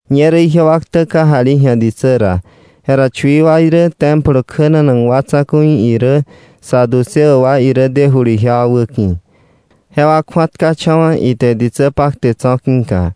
Ñerä ijewa ktä kate ji̱a ditsä ra, jera chui wa irä, Templo kjänanak wa tsa̱ku̱i irä, saduceo wa irä, dejulu ijewa wäki̱. Jewa kju̱atkacha̱wa̱, ite ditsä pakte tso̱ ki̱ka,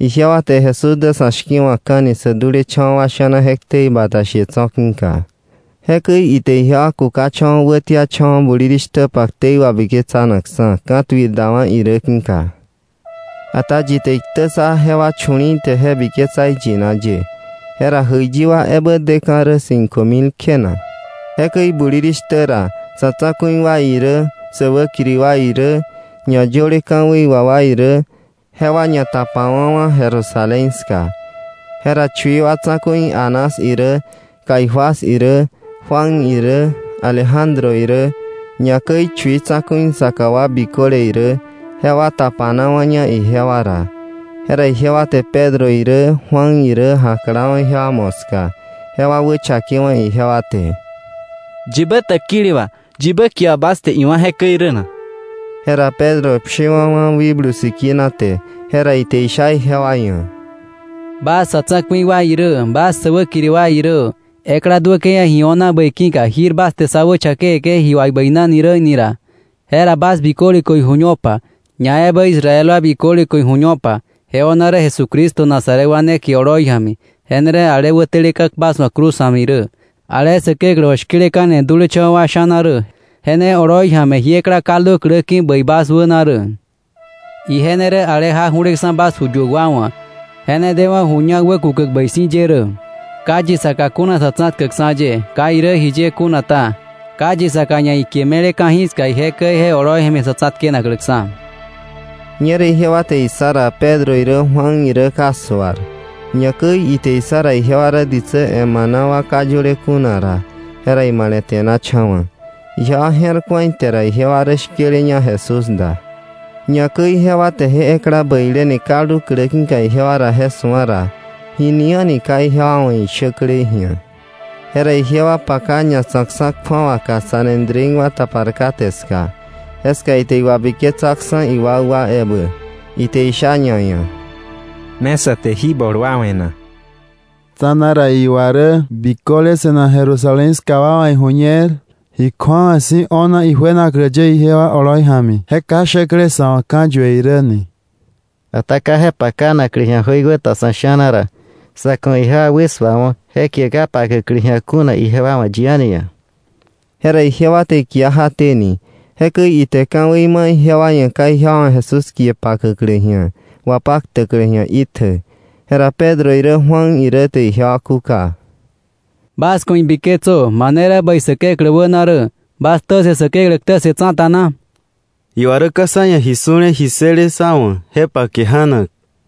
ijewa te Jesús dä sa̱ shki̱wa̱kka̱ni sä dulecha̱wa̱ wa sha̱na je ktei bata she tso̱ ki̱ka. Jekäi ite ijewa kukacha̱wa̱ wätiacha̱wa̱ bulirishtäpa ktei wabiketsanakksa̱, ka̱tuir dawa̱ irä ki̱ka. Ata yi te iktä ssa jewa chu̱li̱i̱ te je biketsa iyina ye. Jera jäiyi wa ebä deka̱ rä cinco mil kjena. Jekäi bulirishtä ra sa̱ tsa̱ku̱i wa irä, säwäkiri wa irä, ñayöle ka̱wei wà wa irä, jewa ñatapawa̱wa̱ Jerusalén ska. Jera chui wa tsa̱ku̱i Anás irä, Caifás irä, Juan irä, Alejandro irä, ñakäi chui tsa̱ku̱i saka wa biköle irä, jewa tapanawa̱ña ijewa ra. Jera ijewa te Pedro irä Juan irä, jaklawa̱ ijewa moska, jewa wächakewa̱ ijewa te: —¿Yibä täkili wà, yibä kie wà bas te iwá̱ jekäi rä na? Jera Pedro pshiwa̱wa̱ Wikblu Sikina te, jera ite isha ijewa ia̱: —Bas sa̱ tsa̱ku̱i wa irä, bas sä wäkiri wa irä, ekla duäke̱ ia̱ ji o̱na bäi ki̱ka jir bas te sá wächa̱kewe̱ke̱, ji wà ibäinani räí̱ ni ra, jera bas biköle ku̱ iju̱ñopa, ñaebä Israel wa biköle ku̱ iju̱ñopa, je o̱na rä Jesucristo Nazaret wa ne kie oloi ja̱mi, je ne rä ale wäteleka̱ bas wa̱ cruz ja̱mi rä, ale Säkeklä wa̱ shki̱leka̱ni dulecha̱wa̱ wa sha̱na rä, je ne oloi ja̱mi jí ekla kaldu klä ki̱ bäi bas wäna rä. Ije ne rä ale jak ju̱leksa̱ bas ju yuäk wa wa̱, je ne dewa̱ ju ñak wäkukäk bäi si̱ ye rä. Ka yi saka kuna Sa̱tsa̱tkäkksa̱ ye. Ka irä jiye kuna ta, ka yi saka ia̱ kie me̱le ka̱jiska ije käi je oloi ja̱mi sa̱ tsa̱tkenakläksa̱. Ñerä ijewa te issa ra Pedro irä Juan irä ka suar, ñakäi ite issa ra ijewa rä ditsä emana wa ka yöle kuna ra, jera imale̱te̱nacha̱wa̱. Ijewa je̱r ku̱a ite ra ijewa rä shkeleña Jesús da. Ñakäi jewa te je ekla bäileni kaldu klä ki̱ ijewa ra je su̱a ra, jini a̱ni ka ijewa wa̱ ishäklei ji̱a. Jera ijewa paka ñatsa̱kksa̱ kju̱awaka Sanedrín wa tapar kate ska, jeska ite iwabiketsaksa̱ iwakwa ebä. Ite isha ñaia̱: —¿Me sä te jí bol wa we̱ na? Tsa̱na ra iwa rä biköle se̱nak Jerusalén ska wa wa̱ ijuñer, ji kju̱awa si̱ o̱na ijuenaklä ye ijewa oloi ja̱mi, je ka shäklei sa̱ wa̱ ka̱yue irä ni. Ata ka je pakanaklä ji̱a jöiwäta sa̱ sha̱na ra, sa̱ ku̱ ijewa wäsuawo̱ je kie ka pakäklä ji̱a kuna ijewa wa̱ yi a̱ni ia̱. Jera ijewa te ikia jaténi; jekäi ite ka̱wei ma̱ ijewa ia̱ ka ijewa wa̱ Jesús kie pakäklä ji̱a, wapaktäklä ji̱a itjä. Jera Pedro irä Juan irä te ijewa kúka: —Bas ku̱ ibiketsö, mane rä bäi Säkeklä wäna rä, ¿bas ktä ssë Säkeklä ktä ssë tsa̱ta na? Iwa rä ka sá ia̱ ji su̱le ji ssële sá wa̱ je pake janak.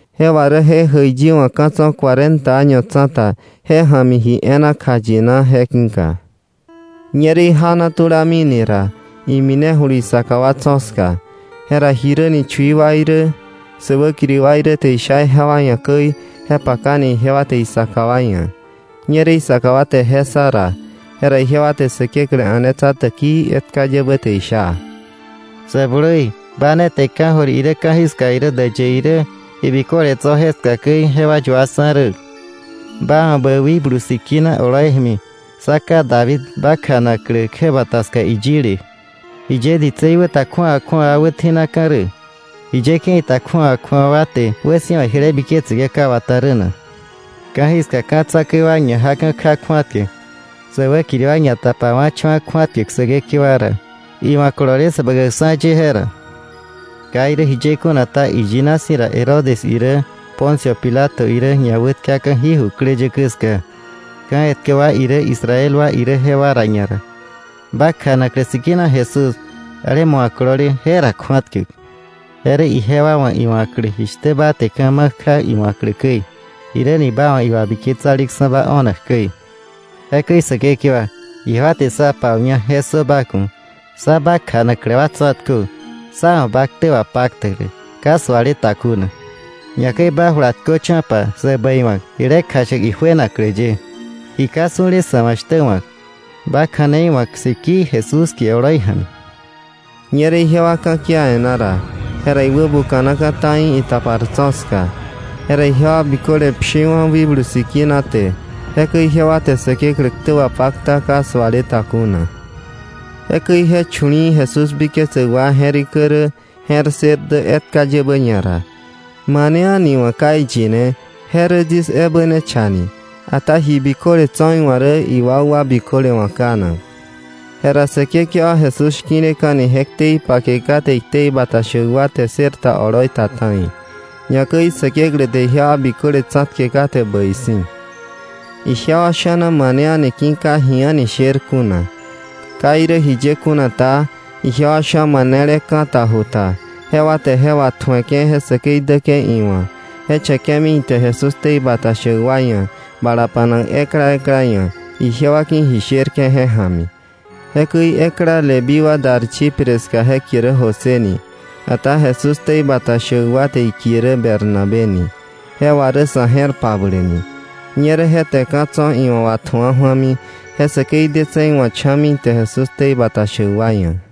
Je wà rä je jäiyi wa̱ ka̱ tso̱ cuarenta año tsa̱ta ja̱mi ji e̱e̱na kjayina je ki̱ka. Ñerä ijana tulamini ra, iminejulu isaka wa tso̱ ska. Jera jiräni chui tsa̱ku̱i wa irä, sä wäkiri wa irä te isha ijewa ia̱ käi, je pakani ijewa te isaka wa ia̱. Ñerä isaka wa te je ssa ra, jera ijewa te Säkeklä a̱netsa täkii etka yebä te isha: “Sä blui, ba ne te ka̱jöir irä ka̱jiska irä däyë irä, ji biköle tso̱ jeska käi jewa yuaksa̱ rä. Ba wa̱ bä Wikblu Sikina oloi ja̱mi sa ká David ba kjanaklä kjäbata ska iyile: ‘¿Jiye ditsei wä ta kju̱awa kju̱awa wa wätji̱naka̱ rä, jiye ke̱i ta kju̱awa kju̱awa wa te wäsi̱wa jile biketseke̱ ka wata rä na? Ka̱jiska ka̱ tsa̱ku̱i wa ñajaka̱ kja kju̱atkäk. Sä wäkiri wa ñatapawa̱cha̱wa̱ kju̱atkäk Säkekewa ra, iwa̱ kolole Säbäkäkksa̱ ye je ra.’ “Ka irä jiye kuna ta, iyina si̱ ra Herodes irä Poncio Pilato irä ñawätkaka̱ jí jukläyäkä ska, ka̱ etkä wa irä Israel wa irä jewa ra ñara, ba kjanaklä sikina Jesús ale ma wa̱ kolole je ra kju̱atkäk. Je rä ijewa wa̱ iwa̱klä jishtä ba te ka̱ ma̱ kja iwa̱klä käi, jiräni ba wa̱ iwabiketsaleksa̱ba o̱nak käi. Jekäi Säkekewa, ijewa te sá pau̱ña je ssö ba ku̱. Sá ba kjanaklä wa tsa̱tkö sá wa̱ ba ktä wapaktäklä ka suale ta kuna. Ñakäi ba jula tköcho̱pa sä bäi wa̱k, jile kjashäk ijuenaklä ye, ji ka su̱le sa̱ wa̱ shtä wa̱k, ba kja̱nei wa̱k sikii Jesús kie oloi ja̱mi.” Ñerä ijewa ka̱kia e̱ná ra, jera iwäbuka̱naka̱ ta̱i itapar tso̱ ska. Jera ijewa biköle pshiwa̱ Wikblu Sikina te. Jekäi ijewa te Säkeklä ktä wapakta ka suale ta kuna. Jekäi je chu̱li̱i̱ Jesús biketsäk wa je̱rikä rä, je̱r ssër dä etka yebä ñara. Mane a̱ni wa̱ ka iyine je rä yis ebä ne cha ni, ata ji biköle tso̱ iwa̱ rä iwakwa biköle wa̱ kanak. Jera Säkekewa Jesús shki̱leka̱ni je ktei pake kate iktei bata shäk wa te ssër ta oloi ta ta̱i. Ñakäi Säkeklä te ijewa biköle tsa̱tke kate bäi si̱. Ijewa sha̱na mane a̱ni ki̱ ka ji a̱ni sher kuna. Ka irä jiye kuna ta, ijewa sha̱ manele ka̱ ta ju ta, jewa te je watju̱eke̱ je säkei däke̱ iwa̱, je che̱ke̱mi ite Jesús ktei bata shäk wa ia̱ bala pa̱nak ekla ekla ia̱, ijewa ki̱ ji sherke̱ je ja̱mi. Jekäi ekla Leví wa dar Chipre ska je kie rä José ni. Ata Jesús ktei bata shäk wa te ikie rä Bernabé ni. (Je wà rä sa̱ je̱r pabläk ni.) Ñerä je te ka̱ tso̱ iwa̱ watju̱a ju̱ami, je säkei detse̱ iwa̱ cha̱mi ite Jesús ktei bata shäk wa ia̱.